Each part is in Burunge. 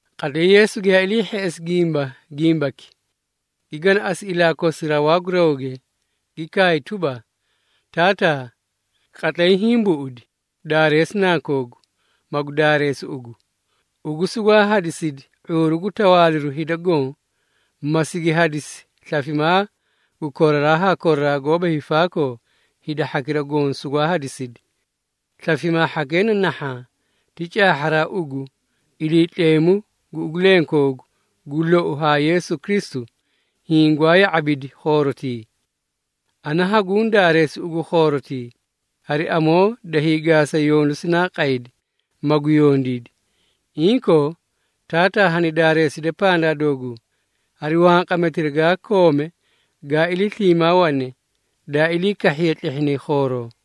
Qatlay Yeesu giyaa ilii hheꞌesi gimba gimbaki, gi ganaꞌasi ilaa kosi rawaa gu rawge, gi kaay tuba, “Taataa, qatlay hiĩ buꞌudi! Daareesi Nankoogu, magu daareesi ugu. Ugu sugwaa hadisidi ⁄uuru gu tawaaliru hida goõ, ma sigi hadisi slafimaa gu koraraa haa koraraa goóba hiifaakoo, hida hhakira goõ sugwaa hadisidi. Slafimaa hhakee na nahhaã. Ti caahharaa ugu, Iliitleemu gu ugu lenkoogu gu lou haa Yeesu Kristu, hiĩ gwaa ya⁄abidi khoorotii. Ana haguũ daareesi ugu khoorotii, hari amoo da hiigaasa yondu sinaa qaydi, magu yondiidi. Inkoo, Taataa hani daareeside pandaa dooguu, hari wanqametira gaa koome gaa ilii sliimaa wane, daa ilii kahhiye tlehhinay khooroo.”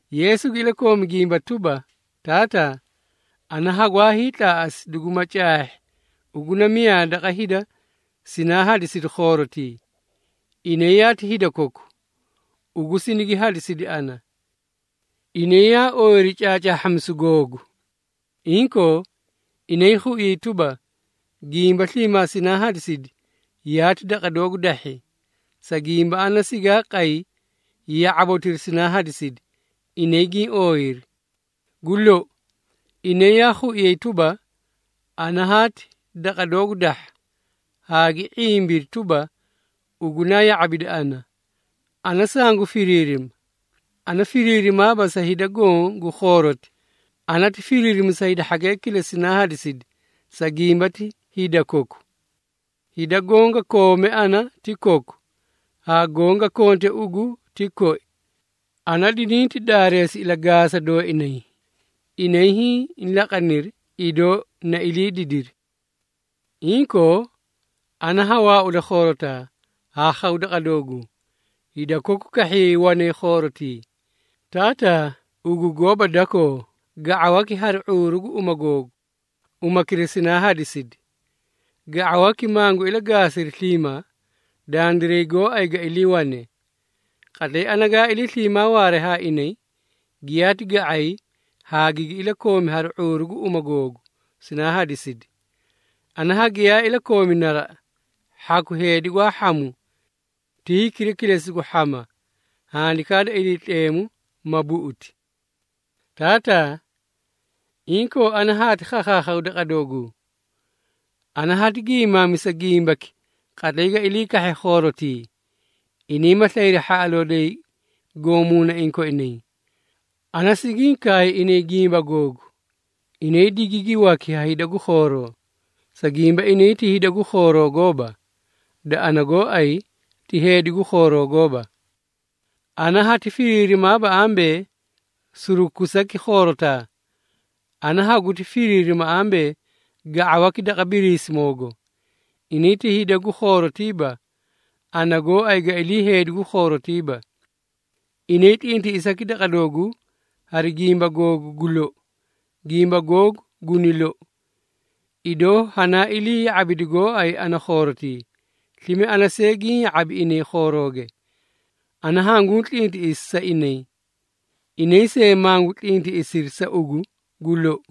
Yeesu gi ilakoomi gimba tuba, “Taataa, ana hagwaa hiitlaaꞌasi duguma caahhi ugu na miyaa daqa hida sinaa hadisidi khoorotii. Inay yaati hida koku, ugu sinigi hadisidi ana. Inay yaa ooyiri caacaahhamisu googu. Inkoo, inay khuiyay tuba, gimba sliimaa sinaa hadisi, yaati daqa doogu dahhi, sa gimba ana sigaa qay ya⁄abotira sinaa hadisidi, inay giĩ ooyiri. Gu lou, inay yaa khuiyay tuba, ana haati daqa doogu dahha, haa gi ⁄imbiri tuba, ugu naa ya⁄abidi ana. Ana sangu firiirima. Ana firiirimaaba sa hida goõ gu khooroti. Ana ti firiirima sa hida hhakee kilesi sinaa hadisidi, sa gimba ti hida koku. Hida goõ ga koome ana ti koku, haa goõ ga konte ugu ti koi. Ana dininti daareesi ilagaasa dooinay. Inay hiĩ laqaniri, idoo na ilii didiri. Inkoo, ana ha waauda khoorotaa, haa khaw daqa dooguu. Hida koku kahhiyay wanay khoorotii. Taataa, ugu gooba dakoo, ga⁄awaki hari ⁄uuru gu uma googu, umakira sinaa hadisidi. Ga⁄awaki mangu ilagaasiri sliimaa, dandiray gooay ga iliiwane. Qatlay ana gaa ilii sliimaa waaree haa inay, giyaati ga⁄ay haa gigi iliikoomi hari ⁄uuru gu uma googu, sinaa hadisidi. Ana hagiyaa ilakoomi naraꞌa, hhaku heedi gwaa hhamu. Ti hikira kilesi gu hhama, Handikaa da Iliitleemu ma buꞌuti. Taataa, inkoo ana haati khakhaakhaw daqa doogu. Ana hati gimaamisa gimbaki qatlay ga ilii kahhe khoorotii, inay ma slayri hhaꞌaloo doyi goõ muunaiĩ koinay. Ana sigiĩ kaay inay gimba googu, inay digigi waki ha hida gu khooroo, sa gimba inay ti hida gu khooroo gooba, da ana gooay, ti heedi gu khooroo gooba. Ana hati firiirimaaba ambee, surukusaki khoorotaa. Ana haguti firiirima ambee, ga⁄awaki daqa Biriisimoogo. Inay ti hida gu khoorotiiba, ana gooay ga ilii heedi gu khoorotiiba. Inay tlintiꞌisaki daqa dooguu hari gimba googu gu lou. Gimba googu guni lou. Idoo hanaa ilii ya⁄abidi gooay ana khoorotii, slime ana see giĩ ya⁄abi inay khoorooge. Ana hanguu tlintiꞌisi sa inay, inay see mangu tlintiꞌisiri sa ugu gu lou.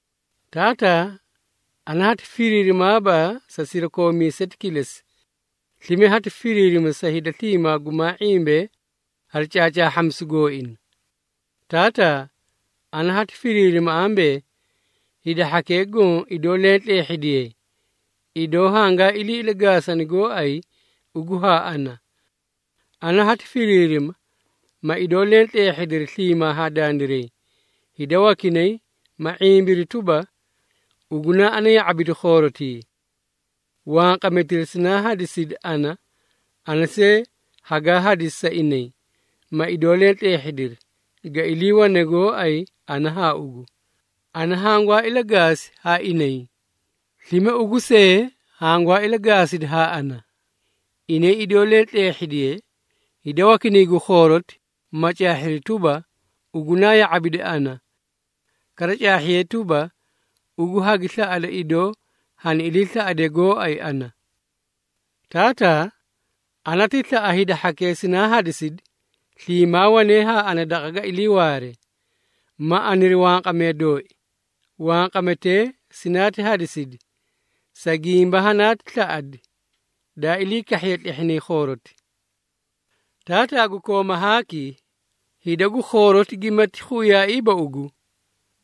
Taataa, ana hati firiirimaaba sa sirakoomiiseti kilesi. Slime hati firiirima sa hida sliimaa gumaa ⁄imbee hari caacaahhamisu gooina. Taataa, ana hati firiirima ambee, hida hhakee goõ idoo leẽ tleehhidiyee, idoo hangaa ilii ilagaasani gooay ugu haa ana. Ana hati firiirima, ma idoo leẽ tleehhidiri sliimaa haa dandiray, hida wakinay, ma ⁄imbiri tuba, ugu naa ana ya⁄abidi khoorotii. Wanqametira sinaa hadisidi ana, ana see hagaa hadisi sa inay, ma idoo leẽ tleehhidiri, ga iliiwane gooay ana haa ugu, ana hangwaa ilagaasi haa inay, slime ugu see hangwaa ilagaasidi haa ana. Inay idoo leẽ tleehhidiyee, hida wakinay gu khooroti ma caahhiri tuba, ugu naa ya⁄abidi ana. Kara, caahhiyee tuba, ugu hagi slaꞌada idoo hani iliislaꞌadee gooay ana. Taataa, ana ti slaꞌa hida hhakee sinaa hadisidi sliimaa wanee haa ana daqa ga iliiwaare, ma aniri wanqamee dooi. Wanqametee sinaati hadisidi, sa gimba hanaati slaꞌadi, daa ilii kahhiye tlehhinay khooroti. Taataa gu kooma haaki, hida gu khooroti gimati khuiyaaiiba ugu,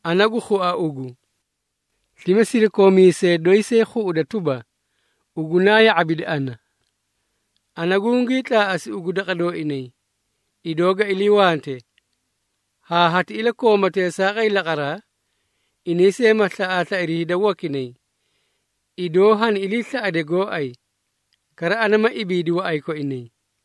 ana gu khua ugu. Slime sirakoomiisee doyi see khuꞌuda tuba, ugu naa ya⁄abidi ana. Ana gungii tlaaꞌasi ugu daqa dooinay, idoo ga iliiwante, haa hati ilakoomaa teesaaqay laqaraa, inay see ma slaꞌaaslairi hida wakinay, idoo hani iliislaꞌade gooay. Kara ana ma ibiidi waꞌay koinay.”